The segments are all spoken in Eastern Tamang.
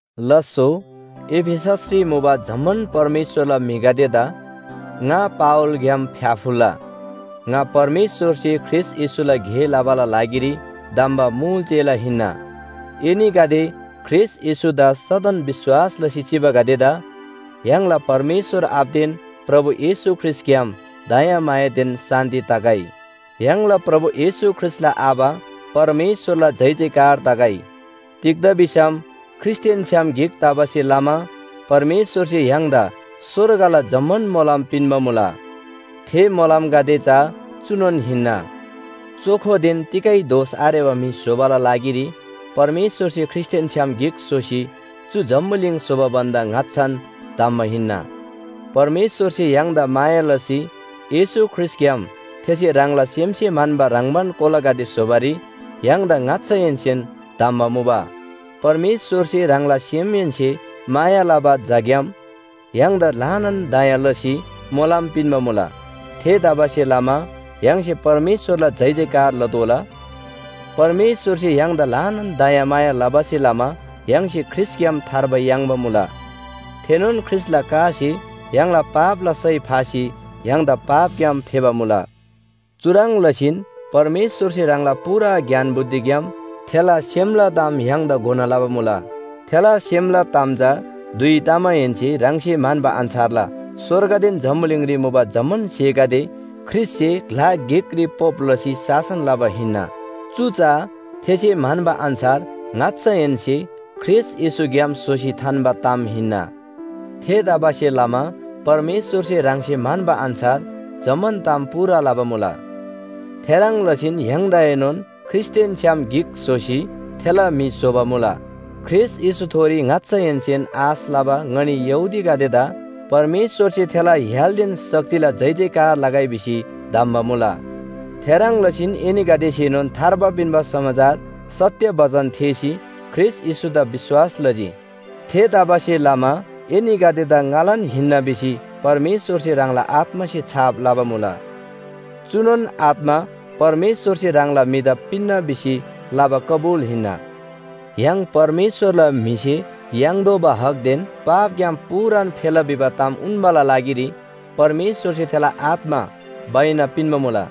लास्‍सो, एफिससरी मुबा जम्‍मान परमेश्‍वरला म्‍हिगदेदा ङा पावलग्‍याम फ्‍याफुल्‍ला! ङा परमेश्‍वरसे ख्रीष्‍ट येशूला गे लबाला लागिरी धम्‍बा मुल चेला हिन्‍ना। एनीगदे, ख्रीष्‍ट येशूदा सदन विश्‍वास लसी चिबागदेदा, य्‍हाङला परमेश्‍वर आबादेन प्रभु येशू ख्रीष्‍टग्‍याम दयामायादेन शान्‍ति तगै। य्‍हाङला प्रभु येशू ख्रीष्‍टला आबा परमेश्‍वरला जयजयकार तगै। तिग्‍दा भिसम ख्रीष्‍टदेन छ्‌याम गिक तबासे लमा परमेश्‍वरसे य्‍हाङदा स्‍वर्गला जम्‍मान मोलम पिन्‍बा मुला। थे मोलमगदे चा चुनोन हिन्‍ना। चोखोदेन तिगै दोष आरेबा म्‍हि स्‍होबाला लागिरी परमेश्‍वरसे ख्रीष्‍टदेन छ्‌याम गिक स्‍होसी चु जम्‍बुलिङ स्‍होबा भन्‍दा ङाच्‍छान धम्‍बा हिन्‍ना। परमेश्‍वरसे य्‍हाङदा माया लसी येशू ख्रीष्‍टग्‍याम थेसे ह्राङला सेमसे म्‍हन्‍बा ह्रङ्‌बान कोलागदे स्‍होबारी य्‍हाङदा ङाच्‍छाहेन्‍सेन धम्‍बा मुबा। परमेश्‍वरसे ह्राङला सेमहेन्‍से माया लबा झाग्‍याम य्‍हाङदा ल्‍हानान दया लसी मोलम पिन्‍बा मुला। थेतबासेलमा य्‍हाङसे परमेश्‍वरला जयजयकार लतोःला। परमेश्‍वरसे य्‍हाङदा ल्‍हानान दयामाया लबासे लमा य्‍हाङसे ख्रीष्‍टग्‍याम थार्बा याङ्बा मुला। थेनोन ख्रीष्‍टला कासे य्‍हाङला पापला सय फासी य्‍हाङदा पापग्‍याम फेबा मुला। चुह्रङ् लसीन परमेश्‍वरसे ह्राङला पूरा ज्ञान बुद्धिग्‍याम थेला सेमला ताम य्‍हाङदा घोना लबा मुला। थेला सेमला ताम चा धुइ तमाहेन्‍से ह्राङसे म्‍हन्‍बा अन्‍छारला स्‍वर्गदेन जम्‍बुलिङरी मुबा जम्‍मान स्‍हेगदे ख्रीष्‍टसे ग्‍ला गिकरी पोप लसी शासन लबा हिन्‍ना। चु चा थेसे म्‍हन्‍बा अन्‍छार ङाच्‍छाहेन्‍से ख्रीष्‍ट येशूग्‍याम स्‍होसी थान्‍बा ताम हिन्‍ना। थेतबासेलमा परमेश्‍वरसे ह्राङसे म्‍हन्‍बा अन्‍छार जम्‍मान ताम पूरा लबा मुला। थेह्रङ् लसीन य्‍हाङदाएनोन ख्रीष्‍टदेन छ्‌याम गिक स्‍होसी थेला म्‍हि स्‍होबा मुला। ख्रीष्‍ट येशूथोरी ङाच्‍छाहेन्‍सेन आश लबा ङनी यहूदीगदेदा परमेश्‍वरसे थेला य्‍हालदेन शक्तिला जयजयकार लगै भिसी धम्‍बा मुला। थेह्रङ् लसीन एनीगदेसेनोन थार्बा पिन्‍बा समाचार सत्‍य बचन थेःसी ख्रीष्‍ट येशूदा विश्‍वास लजी। थेतबासेलमा एनीगदेदा ङालान हिन्‍ना भिसी परमेश्‍वरसे ह्राङला आत्‍मासे छाप लबा मुला। चुनोन आत्‍मा परमेश्‍वरसे ह्राङला म्‍हिदा पिन्‍ना भिसी लबा कबुल हिन्‍ना। य्‍हाङ परमेश्‍वरला म्‍हिसे याङ्तोःबा हकदेन पापग्‍याम पूरान फेला भिबा ताम उन्‍बाला लागिरी परमेश्‍वरसे थेला आत्‍मा बैना पिन्‍बा मुला।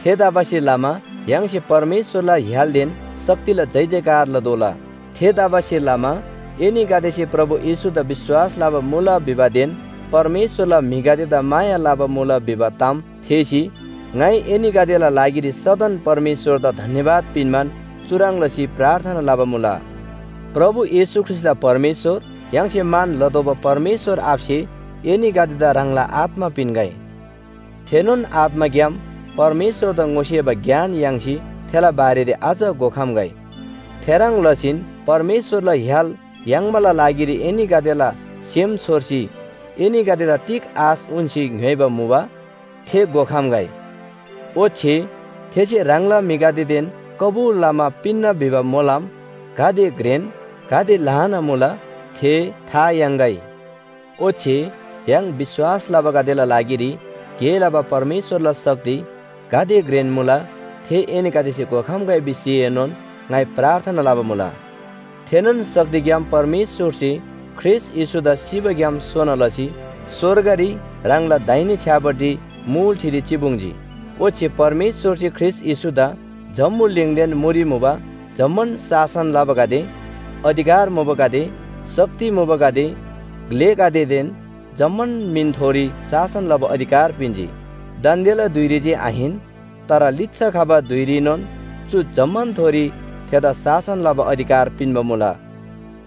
थेतबासेलमा य्‍हाङसे परमेश्‍वरला य्‍हालदेन शक्तिला जयजयकार लतोःला। थेतबासेलमा एनीगदेसे प्रभु येशूदा विश्‍वास लबा मुला भिबादेन परमेश्‍वरला म्‍हिगदेदा माया लबा मुला भिबा ताम थेःसी ङाइ एनीगदेला लागिरी सदन परमेश्‍वरदा धन्‍यवाद पिन्‍बान चुह्रङ् लसी प्रार्थना लबा मुला। प्रभु येशू ख्रीष्‍टला परमेश्‍वर य्‍हाङसे मान लतोःबा परमेश्‍वर आबासे एनीगदेदा ह्राङला आत्‍मा पिन्‍गै। थेनोन आत्‍माग्‍याम परमेश्‍वरदा ङोसेबा ज्ञान याङ्सी थेला बारेरी अझ घोखम्‍गै। थेह्रङ् लसीन परमेश्‍वरला य्‍हाल याङ्बाला लागिरी एनीगदेला सेम छोर्सी एनीगदेदा तिग आश उन्‍सी ङ्‌योइबा मुबा थे घोखम्‍गै। ओच्‍छे थेसे ह्राङला म्‍हिगदेदेन कबुल लमा पिन्‍ना भिबा मोलम गाते घ्रेन गाते ल्‍हाना मुला थे था याङ्‌गै। ओच्‍छे य्‍हाङ विश्‍वास लबागदेला लागिरी गे लबा परमेश्‍वरला शक्ति गाते घ्रेन मुला थे एनीगदेसे घोखम्‍गै भिसीएनोन ङाइ प्रार्थना लबा मुला। थेनोन शक्तिग्‍याम परमेश्‍वरसे ख्रीष्‍ट येशूदा सिबाग्‍याम सोना लसी स्‍वर्गरी ह्राङला दाहिने छ्‌यापट्टि मुल ठिरी चिपुङ्जी। ओच्‍छे परमेश्‍वरसे ख्रीष्‍ट येशूदा जम्‍बुलिङदेन मुरी मुबा जम्‍मान शासन लबागदे, अधिकार मुबागदे, शक्ति मुबागदे, ग्‍लेगदेदेन जम्‍मान मिनथोरी शासन लबा अधिकार पिन्‍जी। दान्‍देला धुइरी जे आहिन, तर लिच्‍छा खबा धुइरीनोन चु जम्‍मानथोरी थेदा शासन लबा अधिकार पिन्‍बा मुला।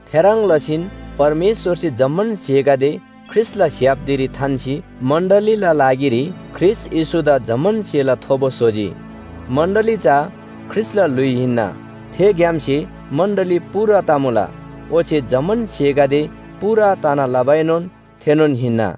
थेह्रङ् लसीन परमेश्‍वरसे जम्‍मान स्‍हेगदे ख्रीष्‍टला स्‍य्‍हाप धिरी थान्‍सी मण्‍डलीला लागिरी ख्रीष्‍ट येशूदा जम्‍मान स्‍हेला थोबो स्‍होजी। मण्‍डली चा ख्रीष्‍टला ल्‍हुइ हिन्‍ना। थेग्‍यामसे मण्‍डली पूरा तमुला। ओच्‍छे जम्‍मान स्‍हेगदे पूरा तना लबाएनोन थेनोन हिन्‍ना।